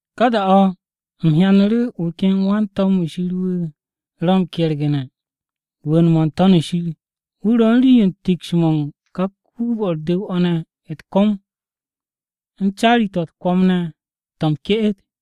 Ka da-o̱ u̱m hyanu̱ru̱ wu̱ ken wan-to̱m-wu̱ Shir wu̱ ro̱ m-kergu̱ne̱ rwu̱u̱n-mo̱ n-To̱n shir. Wu̱ ro̱ u̱n rii-yo u̱n tiks-mo̱ u̱n ka kuub-o̱ u̱r-du̱w o̱ ne̱ u̱t-kom, u̱n caari-to̱ u̱t-kwo̱m ne̱ to̱ m-ke'et.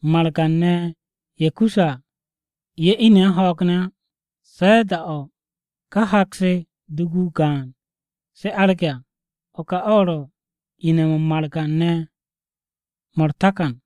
(Margan-ne̱ ye̱ kusse̱ à, ye̱ ine̱ u̱n ho̱o̱g ne̱ á, se̱ da-o̱ ka hak-se dugu-o gaan se arge̱ à.) O̱ ka o̱ ro̱ ine̱-mo̱ u̱n margan-ne̱ mo̱ takan.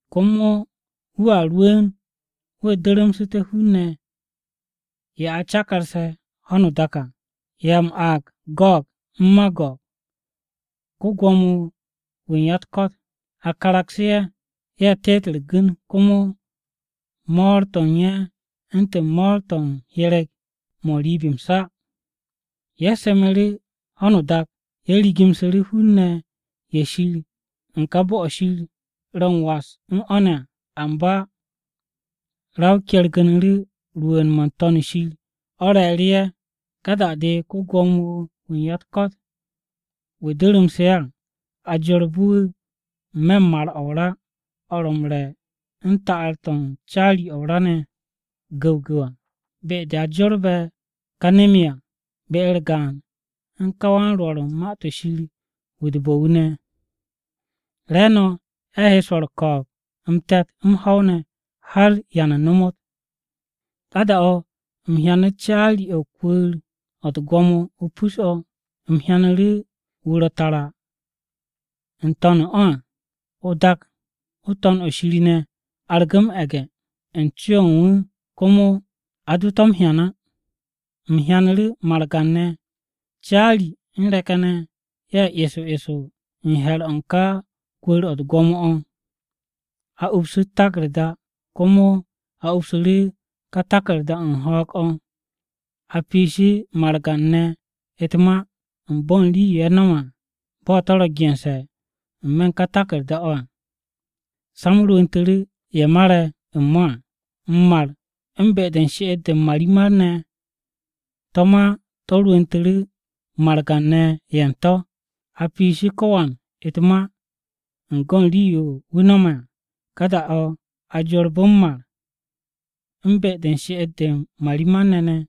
Komo wu̱a rwu̱u̱n, wu̱ du̱ru̱msu̱te̱ hun-ne̱ ye̱ a cakarse̱ ho̱no o-dak à. Ye̱ a m-aag, Go̱o̱g u̱n Mago̱o̱g. Ko-Gwo̱mo-wu̱ u̱n ya-u̱t-ko̱t a karagsu̱ ye̱ ye̱ teet u̱r-gu̱n, komo mo̱o̱r-to̱ u̱n ye̱ u̱ntu̱n mo̱o̱r-to̱ m-hyereg mo̱ n-riib o̱ m-sa. Ye̱ semu̱ru̱ ho̱no o-dak, ye̱ rigu̱msu̱ru̱ hun-ne̱ ye̱ Shir u̱n ka bo̱-o̱ Shir ro̱ m-was ne̱ à. Amba ra-o kergu̱nu̱ru̱ rwu̱u̱n-mo̱ n-To̱n shir o̱ re̱e̱ru̱ ye̱. Ka da-de ko-Gwo̱mo-wu̱ u̱n ya-u̱t-ko̱t wu̱ durumse̱ ye̱ à, a jorbu̱ wu̱ n-me̱ u̱n mar-o̱ o-ra o̱ ro̱ m-re̱ u̱n ta'ar-to̱ u̱n caari-o̱ o-ra gu̱wgu̱w à, be-de a jorbe̱ ka nem-yo à be-u̱r gaan u̱n ka wan-rwo̱r u̱n ma-to̱ shir wu̱ u̱t-bo̱ wu̱ ne̱. Re̱e̱no̱ ye̱ he swo̱ u̱r-ko̱o̱b m-te̱t, m-ho̱w ne̱, har da-o̱ ba m-ta. Ka da-o̱ u̱m hyanu̱ caari-o̱ o-kwu̱u̱r o̱ u̱t-gwo̱mo o-pus o̱. U̱m hyanu̱ru̱ wu̱ ro̱ tara n-to̱n o̱ à. O-dak n-To̱n o̱ shir ne̱ argu̱ m-e̱ge̱ u̱n co-o̱ u̱n wu̱ komo a do to̱ ne̱ m-hyan á. U̱m hyanu̱ru̱ margan-ne̱, caari u̱n re̱k-ye̱ ne̱, ye̱ eso eso n-he̱r o̱ u̱n ká kwu̱u̱r-o̱ u̱t-gwo̱mo o̱. A upsu̱ u̱t-taku̱rda, komo a upsu̱ru̱ ka taku̱rda-o̱ u̱n ho̱o̱g-o̱. A piishu̱ margan-ne̱ u̱t-ma u̱n bo̱ u̱n rii-yo ye̱ no̱me̱ à, bo̱ to̱ ro̱ gense̱ n-me̱ u̱n ka taku̱rda-to̱ à. Sa-m rwu̱ntu̱ru̱ ye̱ mare̱ u̱n mo̱ à. M-mar u̱n be-de u̱r-she'et de u̱n marimar-ne̱ ne̱ to̱ ma to̱ rwu̱ntu̱ru̱ margan-ne̱ ye̱ u̱n to̱. A piishi ko̱wan u̱t-ma u̱n go̱n rii-yo wu̱ no̱me̱ à. Ka da-o̱ a jorbu̱ m-mar u̱n be-de u̱n she'et-de u̱n margan-ne̱ ne̱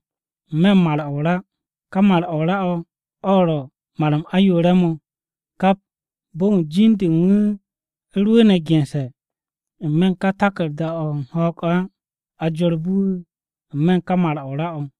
n-me̱ u̱n mar-o̱ o-ra. Ka mar-o̱ o-ra o̱ ro̱ mar-m ayoore̱-mo̱. Kap bo̱n wu̱ jin-de u̱n wu̱ rwu̱u̱ne̱ gense̱ n-me̱ u̱n ka taku̱rda-o̱ u̱n ho̱o̱g-o̱ á, a jorbu̱ wu̱ n-me̱ u̱n ka mar-o̱ o-ra o̱.